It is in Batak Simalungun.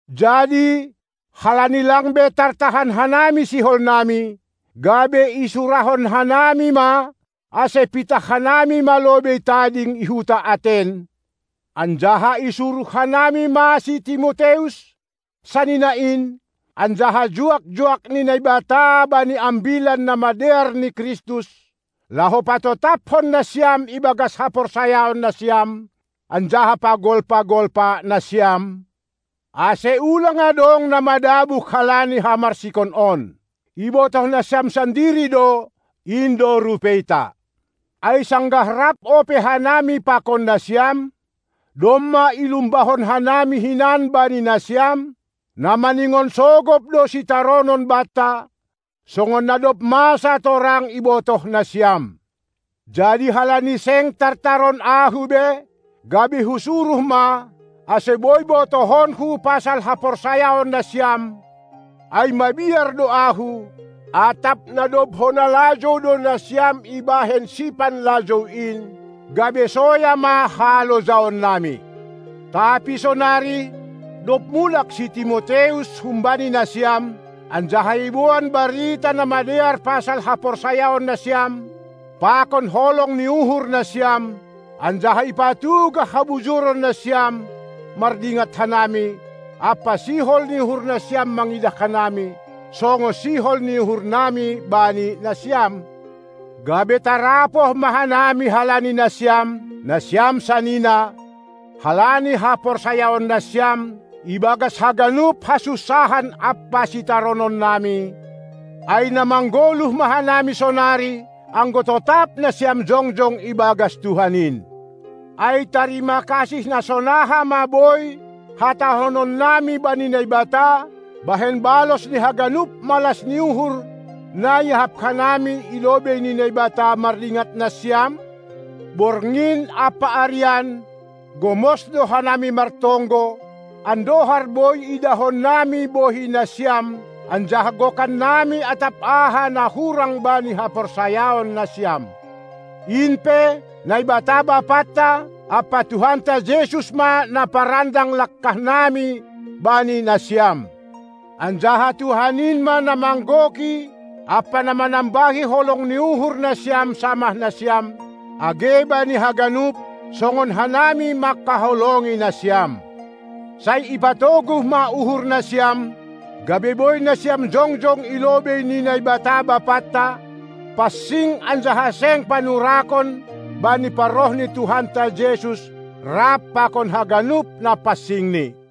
Jadi halani lang be tartahan hanami siholnami, gabe isurahon hanami ma, ase pitah hanami ma lobei tading i huta Aten, anjaha isuruh hanami ma si Timoteus, sanina in, anjaha juak-juak ni Naibata bani Ambilan Namadear ni Kristus, laho patotaphon nasiam ibagas haporsayaon nasiam anjaha pagolpa-golpa nasiam, ase ulang adong na madabuh halani hamarsikon on. Ibotoh nasiam sandiri do, in do rupeita. Ai sanggah rap ope hanami pakon nasiam, domma ilumbahon hanami hinan bani nasiam, na maningon sogop do sitaronon banta, songon na dob masa torang ibotoh nasiam. Jadi halani seng tartaron ahu be, gabe husuruh ma, ase boi botohonku pasal haporsayaon nasiam, ai mabiar do ahu, atap na dob hona lajou do nasiam ibahen sipanlajou in, gabe soya ma halojaonnami. Tapi sonari, dob mulak si Timoteus humbani nasiam, anjaha iboan barita na madear pasal haporsayaon nasiam pakon holong ni uhur nasiam, anjaha ipatugah habujuron nasiam mardingat hanami ampa sihol ni uhur nasiam mangidah hanami, songon sihol ni uhurnami bani nasiam, gabe tarapoh ma hanami halani nasiam, nasiam sanina, halani haporsayaon nasiam, ibagas haganup hasunsahan ampa sitarononnami, ai na manggoluh ma hanami sonari, anggo totap nasiam jongjong ibagas Tuhan in. Ai tarima kasih na sonaha ma boi hatahononnami bani Naibata, bahen balos ni haganup malas ni uhur na iahap hanami i lobei ni Naibata mardingat nasiam? Borngin ampa arian gomos do hanami martonggo, andohar boi idahonnami bohi nasiam anjaha gokannami atap aha na hurang bani haporsayaon nasiam. In pe, Naibata Bapanta ampa Tuhanta Jesus ma na parandang langkahnami bani nasiam! Anjaha Tuhan in ma na manggoki ampa na manambahi holong ni uhur nasiam samah nasiam, age bani haganup, songon hanami mangkaholongi nasiam. Sai ipatoguh ma uhur nasiam, gabe boi nasiam jongjong i lobei ni Naibata Bapanta, pansing anjaha seng panurakon bani parroh ni Tuhanta Jesus rap pakon haganup na pansingNi.